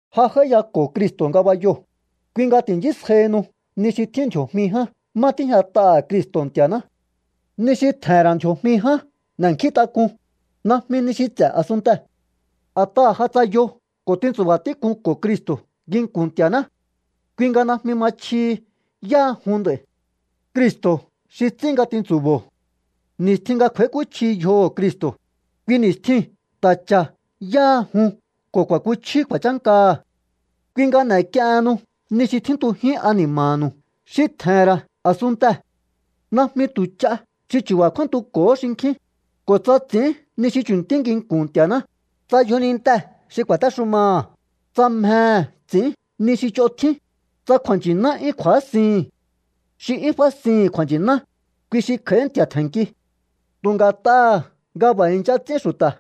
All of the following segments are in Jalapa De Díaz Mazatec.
Ja j'áíyako̱o Cristo̱ ngabayoo̱, kui nga ti̱nchísjaihinu ni xi tjín ndji̱o̱jmi ján má tíjñat'aha̱ Cristo̱ Nti̱a̱ná. Ni xi tje̱he̱n ra̱ ndji̱o̱jmi ján n'e̱nkjíntak'un, najmi ni xi ts'e̱ a̱sunntee̱. A̱t'aha̱ ja tsayo ko̱ tintsu̱ba̱ tík'unko̱o Cristo̱ nginku̱n Nti̱a̱ná. Kui nga najmi ma chjihi yáha jun nd'a̱i̱. Cristo̱ xi ts'ín nga tintsu̱bo̱o. Ni̱stjin nga kj'u̱a̱íkúchji yjoho̱ Cristo̱, kui ni̱stjiu̱n ta̱ cha̱ yáha jun ko̱ ku̱a̱kúchjiu kju̱a̱chánkaha̱. Kui nga n'e̱k'iehennu ni xi tjíntujín ani̱ma̱nu̱u xi tje̱he̱n ra̱ a̱sunntee̱. Najmi tu̱ ch'a xi chu̱ba̱ kjúántuko̱hó xinkjín, ko̱ tsa ts'i̱ín ni xi chu̱ntí nginku̱n Nti̱a̱ná, tsa yjonintee̱ xi ku̱a̱téxumaha̱, tsa mjehe̱ ts'i̱ín ni xi ch'on tjín, tsa kju̱a̱nchi̱ná 'yún kju̱ásihi̱n. Xi 'yún fásihi̱n kju̱a̱nchi̱ná, kui xi kj'a̱í nti̱a̱ tje̱nnki. Tu̱ nga̱t'aha̱ nga b'a̱ i̱ncha ts'ín xu̱ta̱,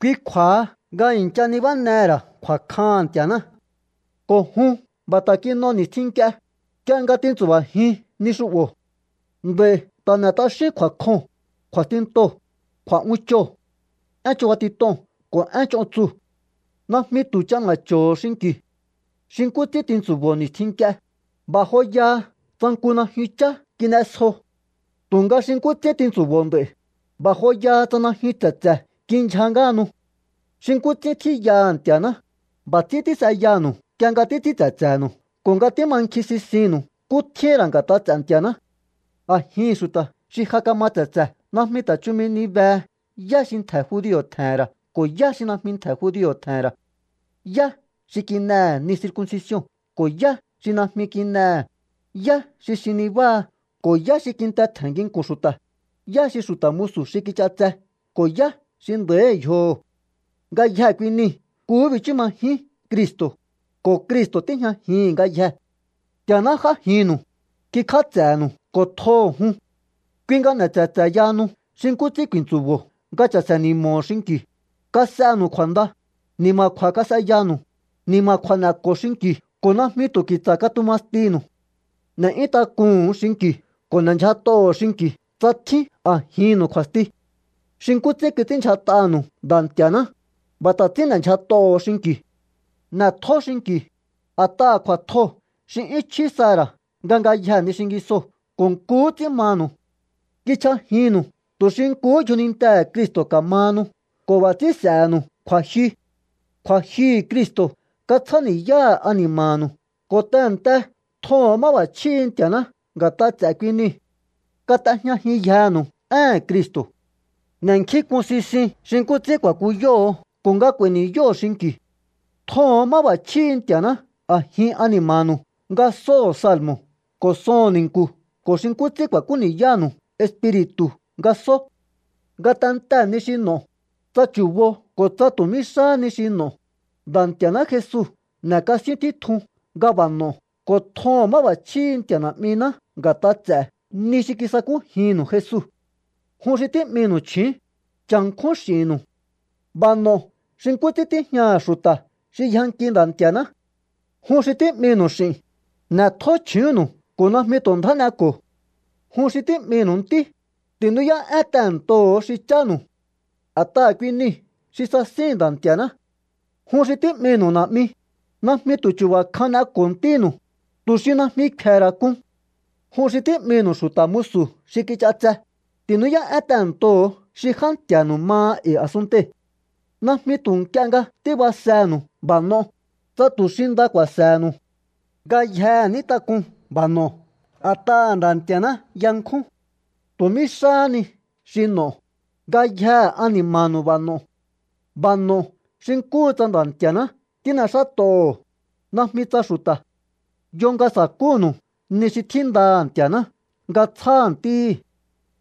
kui kju̱a̱ha nga i̱ncha nibánehe̱ ra̱ kju̱a̱kjaha̱n Nti̱a̱ná. Ko̱ jun b'a̱ ta̱ kin'o ni̱stjin nk'ie, nk'ie nga tintsu̱ba̱jiun ni xu'bo̱. Nd'a̱i̱ ta̱ n'e̱ t'axíún kju̱a̱kjoo̱n, kju̱a̱stintoo̱, kju̱a̱'unchoo̱, én chubatit'oo̱n ko̱ én ch'on tsuu̱. Najmi tu̱ ch'ana̱cho̱ho̱ xinki̱u. Xi nkú ts'ín tintsu̱bo̱o ni̱stjin nk'ie, b'a̱ joyaha tsa nku najyun chá kin'esjo. Tu̱nga xi nkú ts'ín tintsu̱bo̱o nd'a̱i̱, b'a̱ joyaha tsa najyun tse̱tse̱ kindyja ngáhanu. Xi nkú ts'ín tjíyaha̱ Nti̱a̱ná, b'a̱ ts'ín tís'eyanu̱u nk'ie nga títs'ín tse̱tse̱nu̱u ko̱ nga tímankjin sisinnu̱u nkú tjíhi̱n ra̱ nga̱t'a ts'e̱ Nti̱a̱ná. A̱jihi̱n xu̱ta̱ xi ja kama tse̱tse̱ najmi ta̱ chumi ni behe yá xi ntje̱ judio̱ tje̱he̱n ra̱ ko̱ yá xi najmi ntje̱ judio̱ tje̱he̱n ra̱, yá xi kin'ehe̱ ni circuncision ko̱ yá xi najmi kin'ehe̱, yá xi xin nibáha ko̱ yá xi kinte tje̱n nginku̱n xu̱ta̱, yá xi xu̱ta̱ musu̱ xi kich'atse ko̱ yá xi nda̱íhi̱ yjoho̱. Ngayjee̱ kui nii̱ nkuhú bichú majín Cristo̱, ko̱ Cristo̱ tíjñajihi̱n ngayjee̱. Nti̱a̱ná j'ájinnu̱u, kikj'áts'e̱nu̱u ko̱ tjoho̱ jun. Kui nga n'e̱ tse̱tse̱ yahanu xi nkú ts'ín ku̱i̱ntsu̱bo̱o nga cha̱se̱ni̱mo̱o xinki̱u, kas'enu̱u kju̱a̱nda, ni̱ma̱kju̱a̱ kas'eyanu̱u, ni̱ma̱kju̱a̱ n'e̱ko̱o xinki̱u ko̱ najmi tu̱ ki̱tsa̱ katuma stinu̱u. N'e̱'yún tak'uhu̱un xinki̱u ko̱ n'e̱ndyjat'oho̱o xinki̱u tsa tjín a̱jinnu̱u kju̱a̱sti. Xi nkú ts'ín kits'ínndyjat'anu̱u Nda̱ Nti̱a̱ná, b'a̱ ta̱ ts'ín n'e̱ndyjat'oho̱o xinki̱u. N'e̱tjó xinki̱u, a̱t'aha̱ kju̱a̱tjoo̱ xi 'yún chjí saha̱ ra̱ nga ngayjee̱ ni xingisoo̱ ko̱ nkuhú ts'ín manu̱u. Kichj'ajinnu̱u tu̱ xi nkuhú yjonintehe̱ Cristo̱ ka̱mahanu ko̱ b'a̱ ts'ín s'e̱he̱nu̱u kju̱a̱jyu. Kju̱a̱jyuhu̱ Cristo̱ katsjáni̱yáha̱ ani̱ma̱nu̱u ko̱ tehe̱nte tjoho̱on máb'a̱chjíhi̱ Nti̱a̱ná nga̱t'a̱ ts'e̱ kui niu̱. Kat'ejñajinyjenu̱u éhe̱n Cristo. N'e̱nkjínk'un sisiun xi nkú ts'ín ku̱a̱kúyoho̱o ko̱ nga k'u̱a̱i̱ ni̱yóho̱o xinki̱u̱. Tjoho̱on máb'a̱chjíhi̱ Nti̱a̱ná a̱jin ani̱ma̱nu̱u nga sóho̱o salmo̱ ko̱ soho̱n ni̱nku̱ ko̱ xi nkú ts'ín ku̱a̱kúyanu̱u Espiri̱tu̱ nga só. Ngatentee̱ ni xi n'o̱o, tsa chu̱bo ko̱ tsa tu̱ mí xáha ni xi n'o̱o, Nda̱ Nti̱a̱ná Jesu n'e̱kasíún títjun nga b'a̱ n'o̱o ko̱ tjoho̱on máb'a̱chjíhi̱ Nti̱a̱ Na̱'miná nga̱t'a ts'e̱ ni xi kisakújinnu̱u Jesu. Jun xi tí'minu̱u chju̱ún, cha̱nkjún x'i̱nnu̱u. B'a̱ n'o̱o xi nkú ts'ín tíjñaha̱ xu̱ta̱ xi yjanki Nda̱ Nti̱a̱ná. Jun xi tí'minu̱u x'i̱n, n'e̱tjó chju̱únnu̱u ko̱ najmi tu̱ ndjá n'eko̱o. Jun xi tí'minu̱u ntí, ti̱nú'yá'én tehe̱ntoho̱o xi chánu̱u. A̱t'aha̱ kui niu̱ xi sasíhi̱n Nda̱ Nti̱a̱ná. Jun xi tí'minu̱u na̱'mi, najmi tu̱ chu̱ba̱ kjahán n'eko̱o ntínu̱u, tu̱ xi najmi kfe̱he̱ ra̱ k'un. Jun xi tí'minu̱u xu̱ta̱ musu̱ xi kich'atse, ti̱nú'yá'én tehe̱ntoho̱o xi já nti̱a̱nu̱u maha e̱i̱ a̱sunntei̱. Najmi tu̱ nk'ie nga tíbasenu̱u b'a̱ n'o, tsa tu̱ xi nda ku̱a̱se̱he̱nu̱u. Ngayjehe ní tak'un b'a̱ n'o̱o a̱t'aha̱ Nda̱ Nti̱a̱ná yankjún. Tu̱ mí xáha ni xi n'o̱o, ngayjehe ani̱ma̱nu̱u b'a̱ no̱o. B'a̱ n'o̱o xi nkúhu tsa Nda̱ Nti̱a̱ná tín'exát'oho̱o, najmi tsa xu̱ta̱. Yo nga sa̱kúnu̱u ni xi tjíndaha̱ Nti̱a̱ná nga tsjáha̱ ntíhi̱.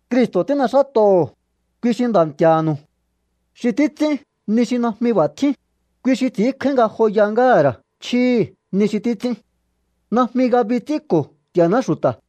Cristo̱ tín'exát'oho̱o, kui xi Nda̱ Nti̱a̱nu̱u. Xi títs'ín ni xi najmi b'a̱ tjín, kui xi ts'i̱ínkjáín ngajoya ngáha̱ ra̱ chjíhi̱ ni xi títs'ín. Najmi ngabi ts'ínko̱ Nti̱a̱ná xu̱ta̱.